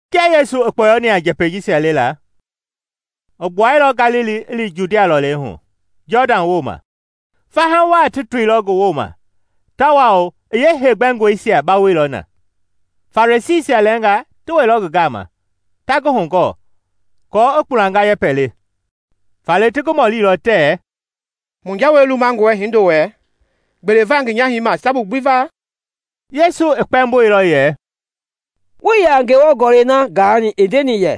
Kia Yesu i kpɔyɔni a njɛpɛi jisia lela, i gbuailɔ Galili i li Judia lɔlei hu, Jɔdan wooma. Faha waa ti toilɔ ngi ma tawao i yeeheegbɛngɔisia bawoilɔ na. Farisiisia lɛɛnga ti wɛilɔ ngi gama ta ngi hugɔ aako i kpulanga yɛpɛ le; faale ti ngi mɔlilɔ tɛɛ, “Mu jawei lumangɔe hindo wɛ gbeleva ngi nyahɛi ma sabu gbi va?” Yesu i kpɛmboilɔ yɛ, “Wuii yaa Ngewɔ Gɔlɛi na gaani i ndeni yɛ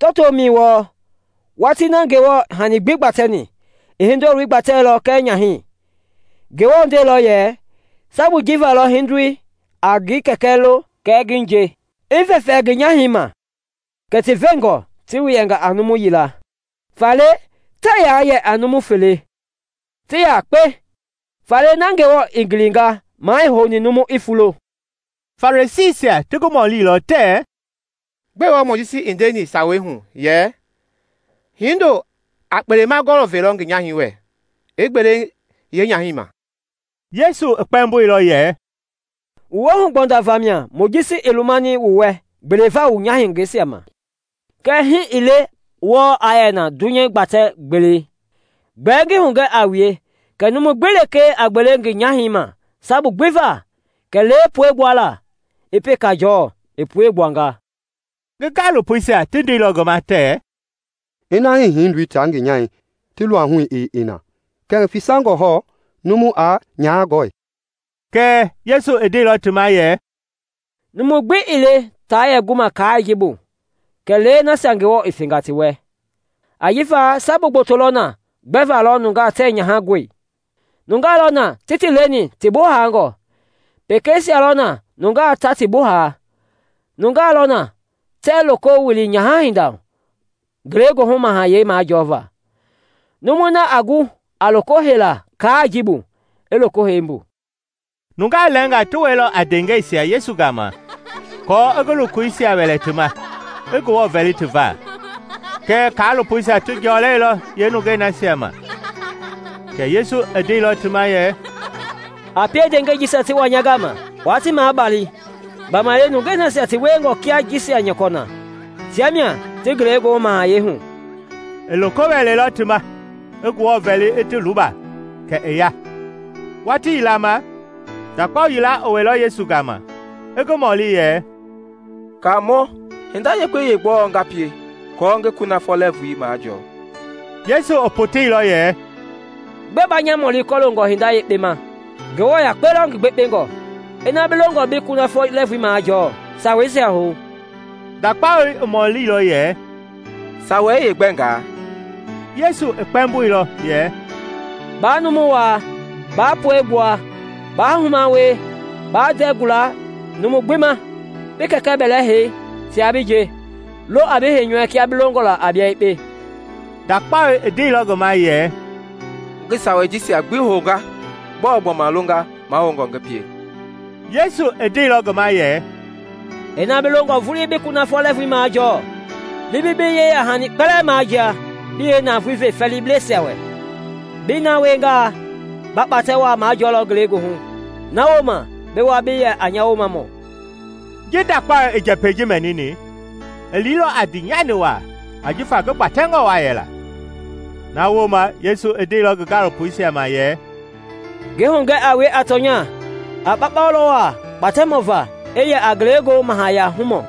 tɔtomɛi wɔɔ, watii na Ngewɔ i hani gbi gbatɛni, i hindoi gbateilɔ kɛɛ nyahɛi, Ngewɔ ndeilɔ yɛ, sabui ji va lɔ hindoi a ngi kɛkɛ lo kɛɛ ngi nje, i vɛfɛ ngi nyahɛi ma, kɛ ti veenjɔ ti yɛnga a numu yila? Faale tɛɛ yaa yɛ a numu fele, ti yakpe. Faale na Ngewɔ i ngilinga, maa ii houni nuuvu i fulo.” Farisiisia ti ngi mɔlilɔ tɛɛ, “Gbɛe hɔɔ Mojisi i ndeni sawei hu yɛ hindoi a kpelema-gɔlɔ velɔ ngi nyahɛi wɛ, i gbele yeenyahɛi ma?” Yesu i kpɛmboilɔ yɛ, “Wu woohugbɔndɛi va mia Mojisi i lumani wu wɛ gbeleva wu nyahangɛisia ma, kɛɛ hii ii le wɔɔ aa yɛ na dunyei gbatɛ gbelei. Gbɛɛ ngi hugɛ a wue kɛ numu gbi lekee a gbele ngi nyahɛi ma sabu gbi va, kɛlee pue gbuala, i peka jɔɔ, i pue gbuanga.” Ngi gaalopoisia ti ndeilɔ ngi ma tɛɛ, “Ina hii hindoi tia ngi nyahɛi ti luahui i na, kɛ fisangɔ hɔɔ numu aa nyaha gɔi.” Kɛɛ Yesu i ndeilɔ ti ma yɛ, “Numui gbi ii le taa yɛ guma kaai ji bu kɛlee nasia Ngewɔ i fenga ti wɛ. Ajifa sabu gboto lɔ na gbɛva lɔ nungaa tɛ nyaha gɔi. Nungaa lɔ na ti ti leni ti buhaangɔ; pekeisia lɔ na nungaa ta ti buhaa; nungaa lɔ na tɛɛ loko wili nyaha hinda hu Ngelegoohu Mahayɛi majɔva. Numui na a gu a loko heila kaa ji bu, i loko hei mbu.” Nungaa lɛɛnga ti wɛilɔ a ndeengɛisia Yesu gama aako i ngi lokoisia wɛlɛ ti ma i Ngewɔ vɛli ti va, kɛɛ kaalopoisia ti jɔlɛilɔ yeenungeisia ma. Kɛɛ Yesu i ndeilɔ yɛ, “A pie ndeengɛisia ti wa nya gama, waa ti mabali, gbamaile nungei nasia ti wiengɔ kia jisia nyɔkɔ tia mia ti Ngelegoohu Mahayɛi hu.” I loko wɛleilɔ ti ma, i Ngewɔ vɛli ti lubava, i li. Watii yila ma, ndakpao yila i wɛilɔ Yesu gama i ngi mɔli yɛ, “Kaamɔ, hinda yekpei yeegbɔɔ nga pie aako ngi kunafɔ lɛɛvui majɔɔ?” Yesu i poteilɔ yɛ, “Gbɛe ba nya mɔlikɔlongohinda yekpe ma? Ngewɔ yakpe lɔ ngi yekpengɔ. Ina bi longɔ bi kunafɔ lɛɛvui majɔɔ, saweisia hou.” Ndakpaoi i mɔlilɔ yɛ, “Sawei yeegbɛngaa?” Yesu i kpɛmboilɔ yɛ, “Baa numu waa, baa pue gbua, baa huma wie, baa ndɛɛ guala numu gbi ma, bi kɛkɛ bɛlɛ hei tia bi nje, lo a bi heinyɔui kia bi longɔ a bia yekpe.” Ndakpaoi i ndeilɔ ngi ma yɛ, “Ngi sawei jisia gbi hounga; gbɔɔ gbɔma i longa mahoungɔ ngi pie?” Yesu i ndeilɔ ngi ma yɛ, “Ina bi longɔ vulii bi kunafɔ lɛɛvui majɔɔ, li bi bi yeyahani kpɛlɛɛ majia bi yeenavoei ve fɛɛliblɛisia wɛ. Bi na wiengaa, ba kpatɛ waa majɔlɔ ngelegoohu. Na wooma bi wa bi yɛ a nya Woomamɔ.” Ji ndakpaoi i njɛpɛi ji mɛnini, i liilɔ a ndiinyani waa ajifa ngi gbatɛngɔ waa yɛla. Na wooma Yesu i ndeilɔ ngi gaalopoisia ma yɛ, “Ngi hugɛ a wue a tɔnya, a kpaukpaulɔ waa Kpatɛmɔ va i yɛ a ngelegoohu mahayɛi humɔ.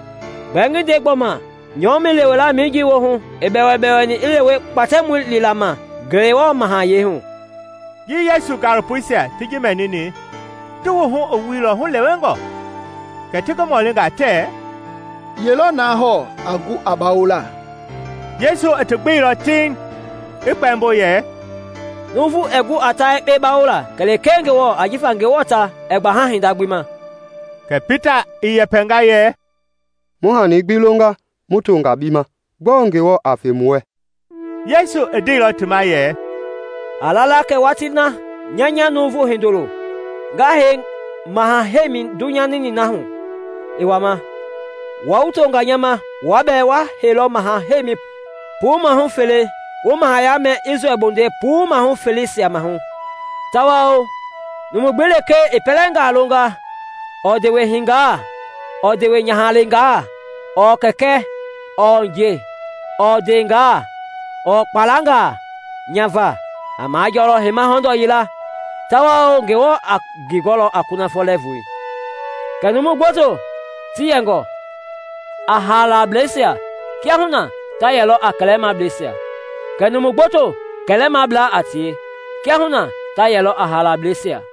Gbɛɛ ngi nde gbɔma, nyɔmɛi lewela mijii woohu i bɛwɛbɛwɛni i lewe kpatɛmɔi lila ma Ngewɔ Mahayɛi hu.” Ji Yesu gaalopoisia ti ji mɛnini, ti wuhu i wuilɔ hulewengɔ, kɛ ti mɔlinga tɛɛ, “Ye lɔ na hɔɔ a gu a bawola?” Yesu i ti gbeilɔ tiŋ i kpɛmbo yɛ, “Nuuvu ɛɛ gu a ta yekpe bawola kɛlee Ngewɔ ajifa Ngewɔ ta ɛɛ gbaha hinda gbi ma.” Kɛ Pita i yɛpɛnga yɛ, “Mu hani gbi longa mu tonga bi ma. Gbɔɔ Ngewɔ a fe mu wɛ?” Yesu i ndeilɔ ti ma yɛ, “A la la kɛ watii na nya nya Nuuvu Hindoloi a hei ngi maha-heimi dunya ninɛi na hu i wama, wua wu tonga nya ma, wua bɛɛ wa heilɔ maha-heima puu maahu fele, wu mahaya mɛ Isrɛl bonda puu maahu feleisia maahu. Tawao numu gbi lekee i pɛlɛngaa longa ɔɔ ndewehinga ɔɔ ndewenyahalengaa ɔɔ kɛkɛ ɔɔ nje ɔɔ ndeengaa ɔɔ kpalangaa nya va, a majɔlɔ heima hɔndɔɔ yila tawao Ngewɔ a ngi gɔlɔ a kunafɔ lɛɛvui. Kɛɛ numu gboto ti yɛngɔ a haalablɛisia kiahuna ta yɛlɔ a kɛlɛmablaa, kɛɛ numu gboto kɛlɛmabla a a tie kiahuna ta yɛlɔ a haalablɛisia.